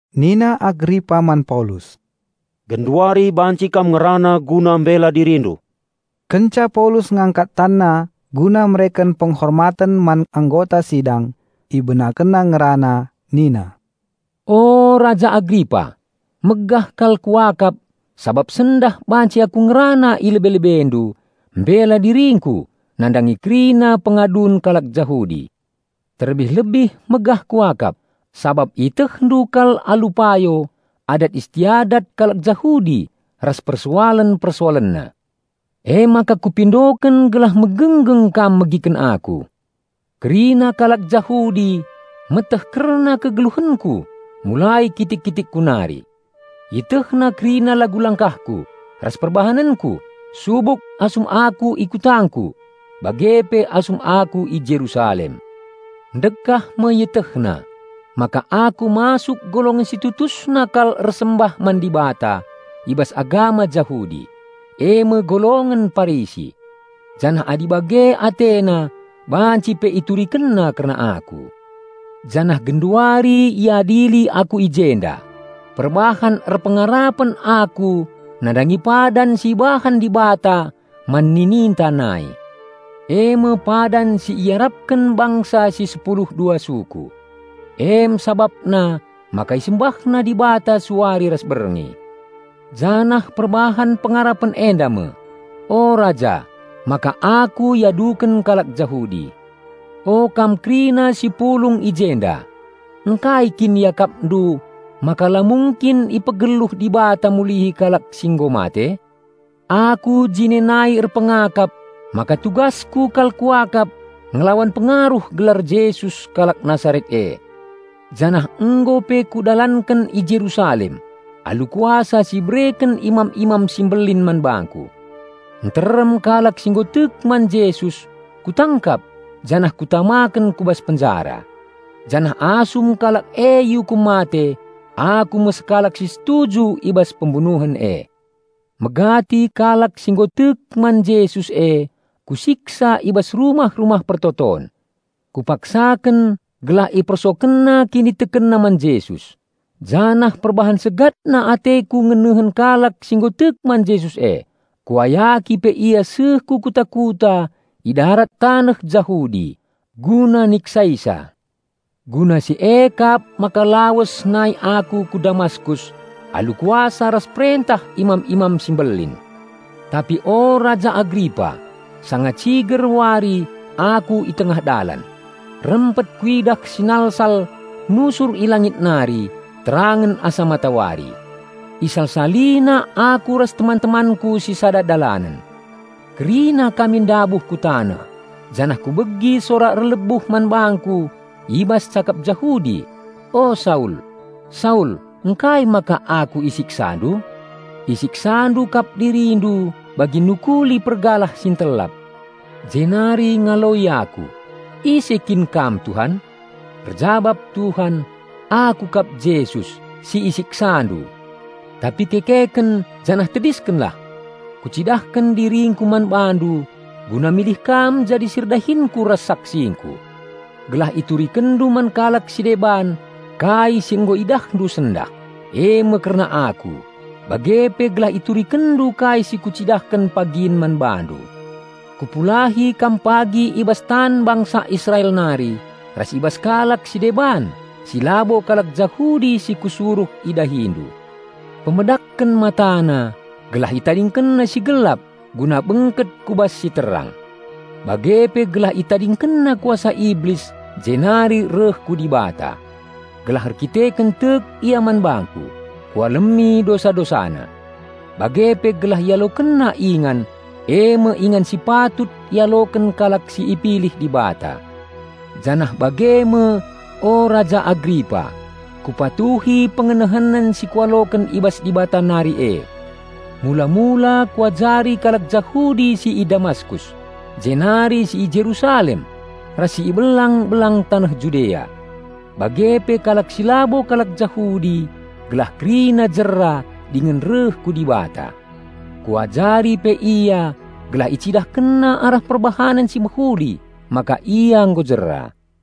Nina Agripa man Paulus, "Genduari banci kam ngerana guna mbela dirindu." Kenca Paulus ngangkat tanna guna mereken penghormaten man anggota sidang, ibenakenna ngerana nina, "O Raja Agripa, megah kal kuakap sabap sendah banci aku ngerana i lebe-lebendu mbela diringku nandangi kerina pengadun kalak Jahudi. Terlebih-lebih megah kuakap sabap ietehndu kal alu payo adat istiadat kalak Jahudi ras persoalen-persoalenna. Emaka kupindoken gelah megenggeng kam megiken aku. Kerina kalak Jahudi meteh kerna kegeluhenku mulai kitik-kitikku nari. Ietehna kerina lagu langkahku ras perbahanenku subuk asum aku i kutangku bage pe asum aku i Jerusalem. Ndekah me ietehna maka aku masuk golongen si tutusna kal ersembah man Dibata i bas agama Jahudi, eme golongen Parisi. Janah adi bage atena banci pe iturikenna kerna aku. Janah genduari iadili aku i jenda perbahan erpengarapen aku nandangi padan si ibahan Dibata man nininta nai. Eme padan si iarapken bangsa si sepulu dua suku. Em sabapna maka isembahna Dibata suari ras berngi. Janah perbahan pengarapen enda me, o raja, maka aku iaduken kalak Jahudi. O kam kerina si pulung i jenda, ngkai kin iakapndu maka la mungkin ipegeluh Dibata mulihi kalak si nggo mate? Aku jine nai erpengakap maka tugasku kal kuakap ngelawan pengaruh gelar Jesus kalak Nasaret e. Janah nggo pe kudalanken i Jerusalem alu kuasa si ibereken imam-imam si mbelin man bangku. Nterem kalak si nggo tek man Jesus kutangkap janah kutamaken ku bas penjara. Janah asum kalak e iukum mate, aku me sekalak si setuju i bas pembunuhen e. Megati kalak si nggo tek man Jesus e kusiksa i bas rumah-rumah persembahen. Kupaksaken gelah ipersokenna kinitekenna man Jesus. Janah perbahan segatna ateku ngenehen kalak si nggo tek man Jesus e, kuayaki pe ia seh ku kuta-kuta i darat taneh Jahudi guna niksaisa." "Guna si e kap maka lawes nai aku ku Damaskus alu kuasa ras perentah imam-imam si mbelin. Tapi o Raja Agripa, sanga ciger wari aku i tengah dalan, rempet kuidah sinalsal nusur i langit nari terangen asa matawari. Isalsalina aku ras teman-temanku si sada dalanen. Kerina kami ndabuh ku taneh janah kubegi sora erlebuh man bangku i bas cakap Jahudi, 'O Saul, Saul ngkai maka Aku isiksandu? Isiksandu kap dirindu bagi nukuli pergalah si entelap.' Jenari ngaloi aku, 'Ise kin Kam Tuhan?' Erjabap Tuhan, 'Aku kap Jesus, si isiksandu. Tapi kekeken janah tediskenlah! Kucidahken diringKu man bandu guna milih kam jadi si erdahinKu ras saksingKu. Gelah iturikenndu man kalak si deban kai si nggo idahndu sendah, eme kerna Aku, bage pe gelah iturikenndu kai si Kucidahken pagin man bandu. Kupulahi kam pagi i bas tan bangsa Israel nari ras i bas kalak si deban si labo kalak Jahudi si Kusuruh idahindu. Pemedakken matana gelah itadingkenna si gelap guna bengket ku bas si terang. Bage pe gelah itadingkenna kuasa Iblis jenari reh ku Dibata. Gelah erdandanken tek ia man bangKu, Kualemi dosa-dosana. Bage pe gelah ialokenna ingan, eme ingan si patut ialoken kalak si ipilih Dibata.'" "Janah bage me, o Raja Agripa, kupatuhi pengenehenen si kualoken i bas Dibata nari e. Mula-mula kuajari kalak Jahudi si i Damaskus jenari si i Jerusalem ras si i belang-belang taneh Judea, bage pe kalak si labo kalak Jahudi gelah kerina jera dingen reh ku Dibata. Kuajari pe ia gelah icidahkenna arah perbahanen si mehuli maka ia nggo jera.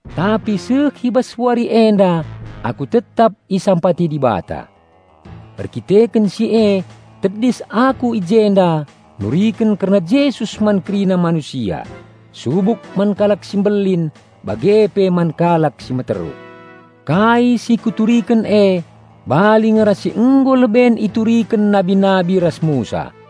Tapi seh i bas wari enda aku tetap isampati Dibata. Erkiteken si e tedis aku i jenda nuriken kerna Jesus man kerina manusia subuk man kalak si mbelin bage pe man kalak si meteruk. Kai si kuturiken e bali nge ras si nggo leben ituriken nabi-nabi ras Musa.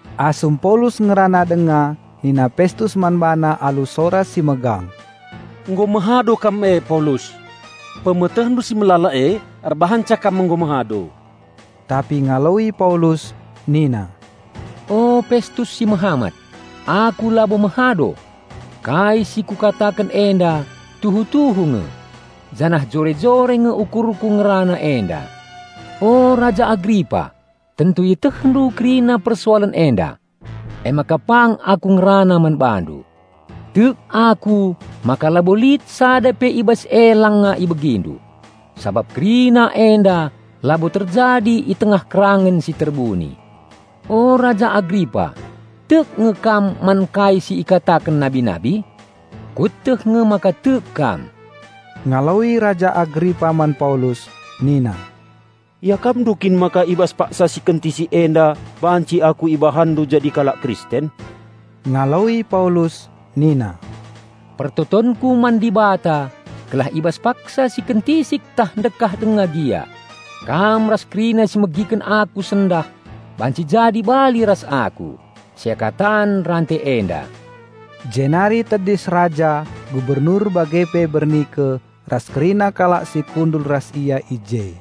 Asum Paulus ngerana denga nina Pestus man bana alu sora si megang, "Nggo mehado kam e Paulus! Pemetehndu si melala e erbahanca kam nggo mehado!" Tapi ngaloi Paulus nina, "O Pestus si mehamat, aku labo mehado. Kai si kukataken enda tuhu-tuhu nge, janah jore-jore nge ukurku ngerana enda. O Raja Agripa, tentu ietehndu kerina persoalen enda, emaka pang aku ngerana man bandu. Tek aku maka labo lit sada pe i bas e langa ibegindu, sabap kerina enda labo terjadi i tengah kerangen si terbuni. O Raja Agripa, tek nge kam man kai si ikataken nabi-nabi? Kueteh nge maka tek kam." Ngaloi Raja Agripa man Paulus nina, "Iakapndu kin maka i bas paksa si kentisik enda banci aku ibahanndu jadi kalak Kristen?" Ngaloi Paulus nina, "Pertotonku man Dibata gelah i bas paksa si kentisik tah ndekah denga gia, kam ras kerina si megiken aku sendah banci jadi bali ras aku, seakatan rante enda." Jenari tedis raja, gubernur bage pe Bernike ras kerina kalak si kundul ras ia i je.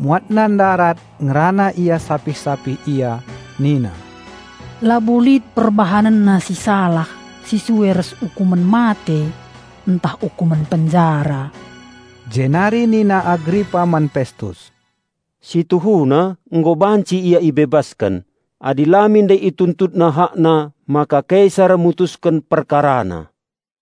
Muatna ndarat ngerana ia sapih-sapih ia nina, "Labo lit perbahanenna si salah si sue ras ukumen mate ntah ukumen penjara." Jenari nina Agripa man Pestus, "Si tuhuna nggo banci ia ibebasken adi la min ndai ituntutna hakna maka Kaisar mutusken perkarana."